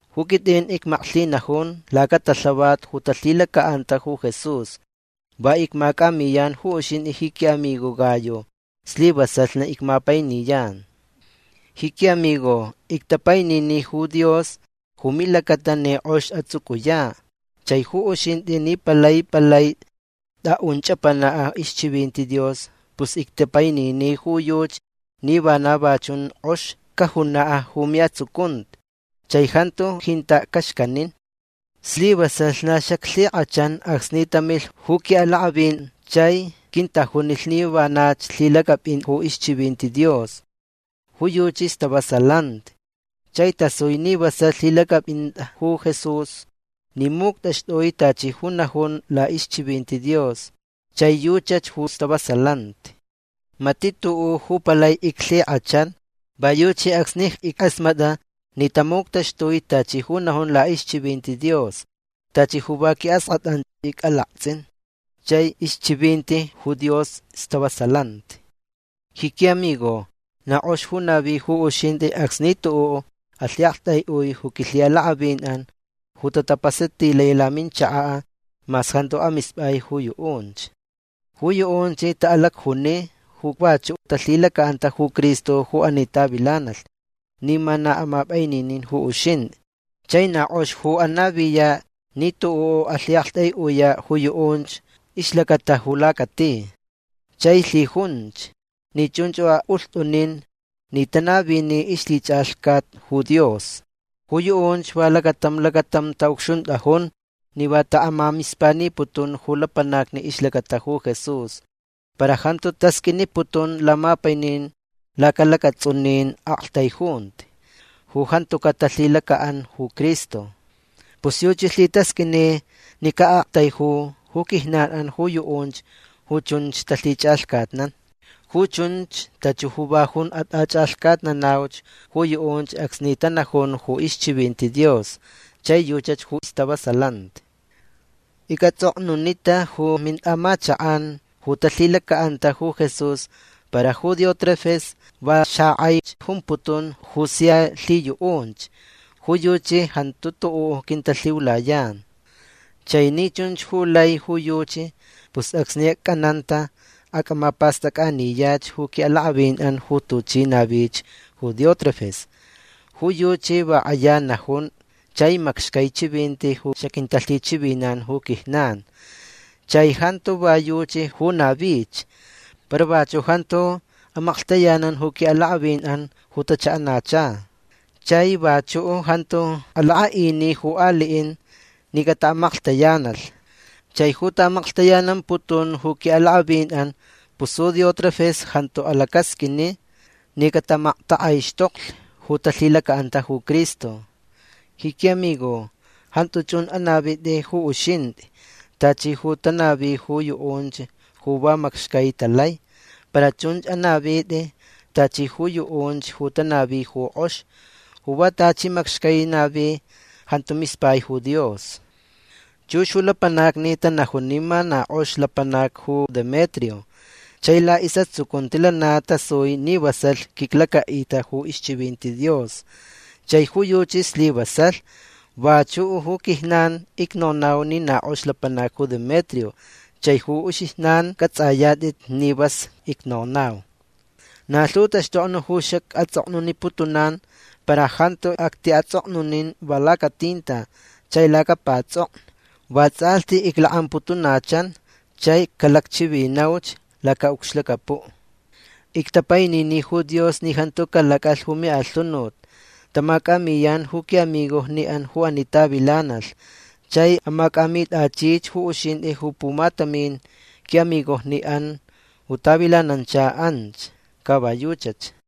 Ju quitʼin icmaklhinajun lacatalhavat ju talhilacaʼanta ju Jesús. Va icmacʼamiyan ju uxintʼi ji quiʼamigo Gayo. Slivasalh na icmapainiyan. Ji quiʼamigo ictapainini ju Dios ju milacata ni kʼox atsʼucʼuyaʼ. Chai ju uxintʼi ni palai palai tʼaʼun chʼapanaʼ ixchivinti Dios pus ictapainini ju yuchi ni vana va chun kʼox cajunaʼ ju miʼatsucunti chai jantu jintaʼ caxcanin. Slivasalh na xaclhikʼachan acsni tamilh ju quiʼalakʼavin chai quintajunilh ni vanach lhilacʼapʼin ju ixchivinti Dios. Ju yuchi stavasalanti. Chai tasui ni vasalh lhilacʼapʼintʼa ju Jesús ni muctʼaxtʼui tachi ju najun laʼixchivinti Dios. Chai yuchach ju stavasalanti. Matiʼ tuʼuʼ ju palai iclhikʼachan. Va yuchi acsni ickʼasmatʼa ni tamuctaxtui tachi ju najun laʼixchivinti Dios tachi ju va quiʼaskʼatʼan icʼalaktsʼin. Chai ixchivinti ju Dios stavasalanti. Ji quiʼamigo na kʼox ju navi ju uxintʼi acsni tuʼuʼ alhiʼaktʼaiʼui ju quilhiʼalakʼavinʼan ju tapasatilai laminchakaʼ mas jantuch amispʼai ju yuʼunch. Ju yuʼunch taʼalacjuni ju vachuʼ talhilacaʼanta ju Cristo ju ani tavilanalh ni ma na amapʼaininin ju uxintʼi. Chai na kʼox ju anaviyaʼ ni tuʼuʼ alhiʼaktʼaiʼuyaʼ ju yuʼunch ixlacata ju lacati. Chai lhijunch ni chunch ju aʼulhtʼunin ni tanavini ixlhichʼalhcat ju Dios. Ju yuʼunch va lacatam lacatam taʼucxuntʼajun ni va taʼamamispaniputun ju lapanacni ixlacata ju Jesús. Para jantu tasqʼuiniputun lamapainin laca lacatsʼunin aʼaktaijunti ju jantucaʼ talhilacaʼan ju Cristo. Pus yuchi lhitasqʼuini ni caʼaʼaktaiju ju quijnanʼan ju yuʼunch ju chunch talhichʼalhcatnan. Ju chunch tachi ju va jun atʼachʼalhcatnanauch ju yuʼunch acsni tanajun ju ixchivinti Dios. Chai yuchach ju stavasalanti. Icʼatsʼoknunita ju mintʼaʼamachakʼan ju talhilacaʼanta ju Jesús para ju Diótrefes va xakʼaich jumputun ju sia lhiyuʼunch. Ju yuchi jantu tuʼuʼ quintalhiulayan. Chai ni chunch ju lai ju yuchi pus acsni acʼananta acʼamapastʼacʼaniyach ju quiʼalakʼavinʼan ju tuchi navich ju Diótrefes. Ju yuchi va kʼaya najun chai macxcai chivinti ju xaquintalhichivinan ju quijnan. Chai jantu va yuchi ju navich. Para vachuʼ jantu amaklhtayanan ju quiʼalakʼavinʼan ju tachaʼanacha. Chai vachuʼ jantu alakʼaʼini ju aliʼin ni cataʼamaklhtayanalh. Chai ju taʼamaklhtayanamputun ju quiʼalakʼavinʼan pus ju Diótrefes jantu alacasqʼuini ni camaktakʼaixtoklich ju talhilacaʼan ju Cristo. Ji quiʼamigo jantu chunch ju anavitʼi ju uxintʼi tachi ju tanavi ju yuʼunch ju va macxcai talai. Para chunch anavitʼi tachi ju yuʼunch ju tanavi ju kʼox. Ju va tachi macxcai navi jantu mispai ju Dios. Chux ju lapanacni tanajun ni na kʼox lapanac ju Demetrio. Chai laʼisʼatsucunti lana tasui ni vasalh quiclacaʼita ju ixchivinti Dios. Chai ju yuchi slivasalh. Vachuʼ ju quijnan icnonau ni na kʼox lapanac ju Demetrio chai ju uxijnan cʼatsʼayatʼit ni vas icnonau. Na lhu taxtokni ju xacʼatsʼoknuniputunan para jantu actiʼatsʼoknunin va lacatinta chai lacapatsʼoknu. Vatsʼalhti iclakʼamputunachan chai calacchivinauch lacaʼucxlacapuʼ. Ictapainini ju Dios ni jantu calacʼalh ju miʼalhunut. Tamacʼamiyan ju quiʼamigojniʼan ju ani tavilanalh. Chai amacʼamitʼachich ju uxintʼi ju pumatamin quiʼamigojniʼan ju tavilanancha anch. Ca va yuchach.